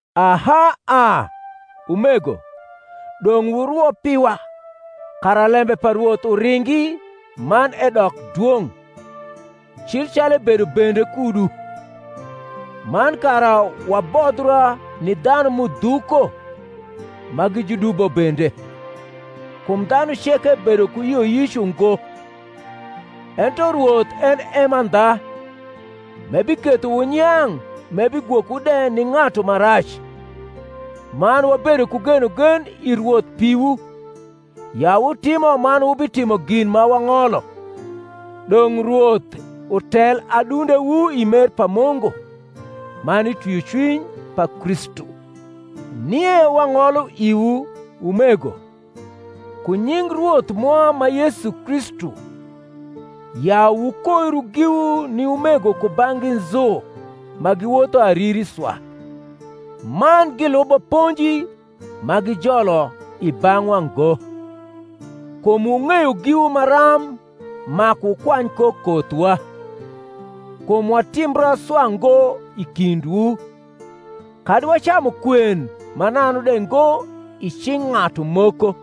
Aha a, umego, dong’ wurwo piwa, kara lembe pa Rwoth uringi man edok dwong’, cil calu ebedo bende kudu; man kara wabodhra ni dhanu m’udhuko ma gi judubo bende; kum dhanu ceke bedo ku yioyic ungo. Ento Rwoth en e mandha, m’ebiketho wunyang’, m’ebigwokowu de ni ng’atu ma rac. Man wabedo ku genogen i Rwoth piwu, ya wutimo man wubitimo gin ma wang’olo. Dong’ Rwoth utel adundewu i mer pa Mungu, man i twiocwiny pa Kristu. Nie wang’olo iwu, umego, ku nying Rwoth mwa ma Yesu Kristu, ya wukoiru giwu ni umego kubang’gi nzu ma giwotho ariri swa, man gilubo ponji ma gijolo i bang’wa ngo. Kum wung’eyo giwu maram maku wukwany ko kothwa: kum watimbra swa ngo i kindwu, kadi wacamu kwen mananu de ngo i cing’ ng’atu moko,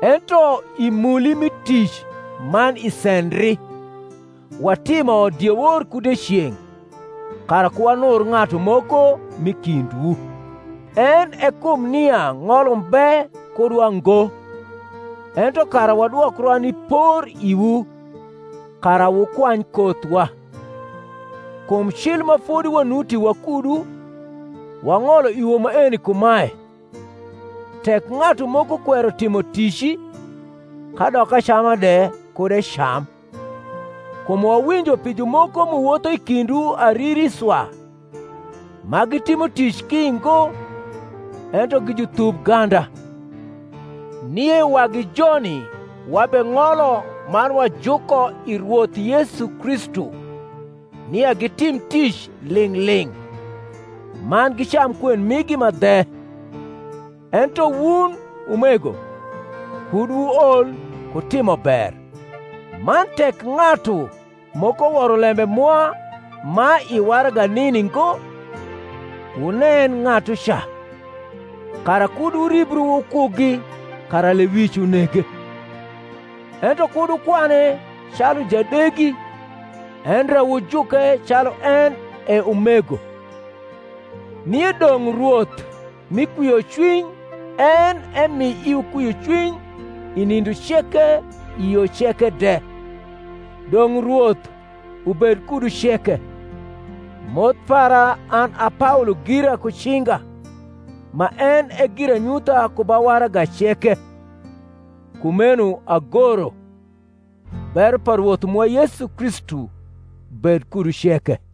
ento i muli mi tic man i sendri, watimo diewor ku dieceng’, kara ku wanur ng’atu moko m’i kindwu: en e kum nia ng’ol umbe kudwa ngo, ento kara wadwokra ni por iwu, kara wukwany kothwa. Kum cil ma fodi wanuti wakudu, wang’olo iwu maeni kumae, Tek ng’atu moko kwero timo tici, kadok acama de kud ecam. Kum wawinjo pi jumoko m’uwotho i kindwu ariri swa, ma gitimo tic ki ngo, ento gi juthubganda. Nie wagi joni wabeng’olo man wajuko i Rwoth Yesu Kristu, nia gitim tic ling’ ling’, man gicam kwen migi ma dhe. Ento wun, umego, kud wuol ku timo ber. Man tek ng’atu moko woro lembe mwa ma i waraga nini ngo, wunen ng’atuca, kara kud wuribru wukugi, kara lewic unege. Ento kud wukwane calu jadegi, endre wujuke calu en e umego. Nie dong’ Rwoth mi kwiocwiny en emi iwu kwiocwiny i nindo ceke i yo ceke de. Dong’ Rwoth ubed kudu ceke. Moth para an a Paolo gira ku cinga, ma en e giranyutha ku ba waraga ceke: kumeno agoro. Bero pa Rwoth mwa Yesu Kristu bed kudu ceke.